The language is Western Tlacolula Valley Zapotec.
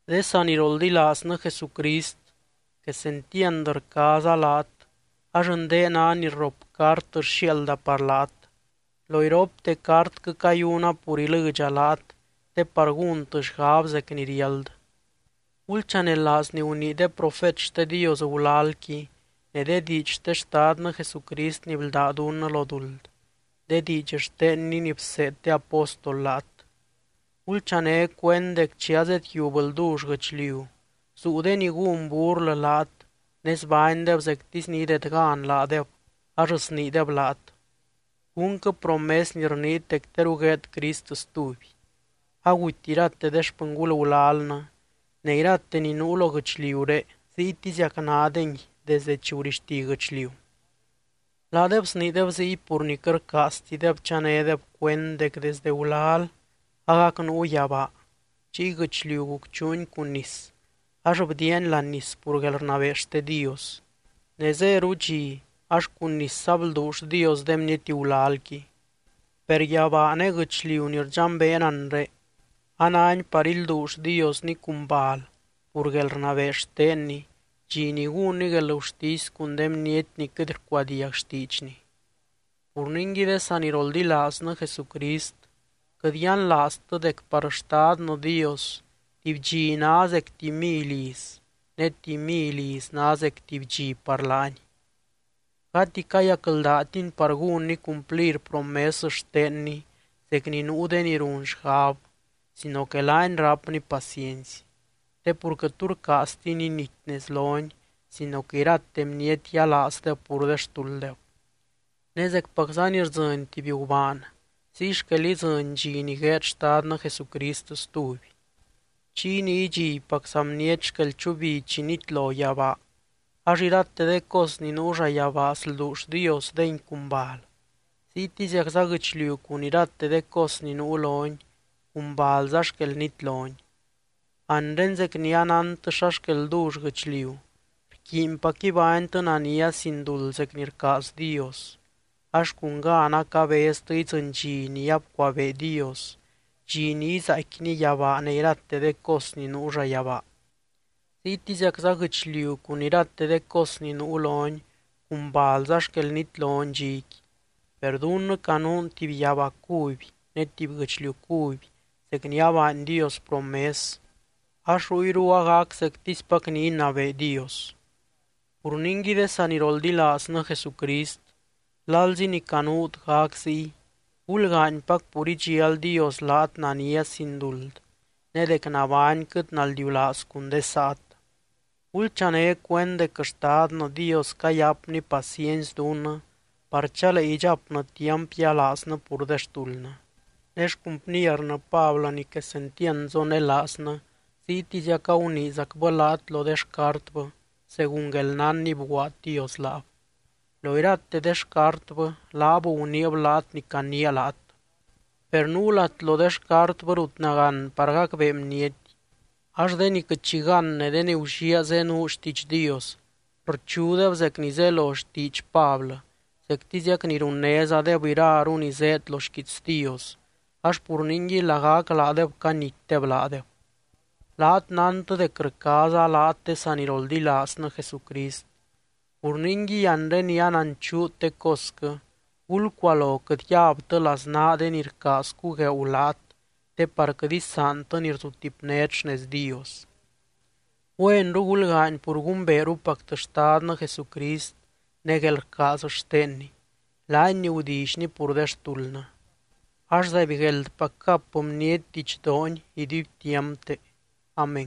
De saniroldilaaznɨ Jesucrist, quesentiand rcaaza laat ax ndé ná ni rrop cart rxiaalda par laat. Lo iropte cartquɨ cayuna pur ilɨdxa laat te par gúntɨ xgab zec ni riáld. Gulchanelaaz ni gunii de profet xte Dios gulalqui, ne de diidx xte Xtadnɨ Jesucrist ni bldá dunnɨ lo duld, de diidx xtenny ni bseed de apóstol laat. Gulchané cuend dec chi azedyiub ldull guɨchliu zuu de ni gún burlɨ laat ne zbánydeb zectisy ni idedgan laadeb ax sniideb laat: “¿Cúnquɨ promes ni rniit dec teru gueed Crist stuby? Aguty irate de xpɨngul gulalnɨ, ne irate ni nuu lo guɨchliuré ziytiziac nádengui desdɨ chi gurixti guɨchliu.” Laadeb sniideb ziy pur ni quɨt rcaaztideb chanédeb cuend dec desde gulal agac nuu yabaa, chiy guɨchliu gucchuuni cun nis ax bdiiani láani nis pur guelrnabee xte Dios. Ne zéru dxi ax cun nisza blduull Dios de bniety gulalqui. Per yabaa ne guɨchliu ni rdxambeen anre, anáni par ilduull Diosni cun bal pur guelrnabee xtenny, dxi ni gúnny guelgurtisy cun de bniety ni quɨt rcuadiag xtiidxny. Pur ningui de saniroldilaaznɨ Jesucrist, quɨt yianlaaztɨ dec par Xtadnɨ Dios, tuby dxi ná zec tuby mily iz ne tuby mily iz ná zec tuby dxi par laany. Gati cayacldátiny par gúnny cumplir promes xtenny zec ni nuu de ni run xgab sino que laany rápny paciency. Te pur quɨt tu rcaaztiny inity nez lony sino que irate bniety yialaazdeb pur de xtulddeb. Ne zecpacza ni rdzɨny tuby gubaan, ziy xquel idzɨny dxi ni gueed Xtadnɨ Jesucrist stuby. Chiy ni idxibpacza bniety xquel chubi chi nitlo yabaa, ax irate de cos ni nuu llayabaa slduull Dios dengui cun bal. Ziytiziacza guɨchliu cun irate de cos ni nuu loni cun balza xquel nitloni. Anre zec ni anántɨ xa xquel ldull guɨchliu, rquiinpac ibánytɨ nania sin duld zec ni rcaaz Dios. Ax cun gan acabeztɨ idzɨny dxi ni abcuabee Dios, dxi ni izaaicquiny yabaa ne irate de cos ni nuu llayabaa. Ziytiziacza guɨchliu cun irate de cos ni nuu loni cun balza xquel nitloni dxiqui. Per dunnɨ canuun tuby yabaa cuby ne tuby guɨchliu cuby zec ni abaany Dios promes, ax ruyru agac zectispac ni inabee Dios. Pur ningui de saniroldilaaznɨ Jesucrist, lalzi ni canuut gac ziy, gulgaanypac pur idxial Dios laat nania sin duld ne dec nabányquɨt naldiulaaz cun de saat. Gulchané cuend dec Xtadnɨ Dios cayapny paciency dunnɨ par chalee idxapnɨ tiamp yialaaznɨ pur de xtuldnɨ. Ne xcumpiernɨ Pablɨ ni quesentiand zonelaaznɨ ziytiziac aguniizacbɨ laat lo de xcartbɨ, según guelnán ni bguaad Dios laab. Lo irate de xcartbɨ, laab guniib laat ni caniia laat. Per nuu lat lo de xcartbɨ rut nagán par gacbee bniety, ax de ni quɨt xi gán ne de ni gulliaa zenuu xtiidx Dios rchudeb zec ni zelo xtiidx Pablɨ, zectiziac ni runnézadeb iraru ni zéed lo xquiits Dios, ax pur ningui lagac laadeb canitdeb laadeb. Laat nántɨ dec rcaaza laat de saniroldilaaznɨ Jesucrist. Pur ningui anre ni ananchuut de cosquɨ, gulcualo quɨt yabtɨ laznaa de ni rcaaz cugueeu laat te par quɨt isaantɨ ni rzutipnét xnez Dios. Güenru gulgaany pur gumbeerupactɨ Xtadnɨ Jesucrist ne guelrcaaz xtenny, laany ni gudillyny pur de xtuldnɨ. Ax, ¡zaibgueldpac gap bniety didxdoony iduibtiampte! Amén.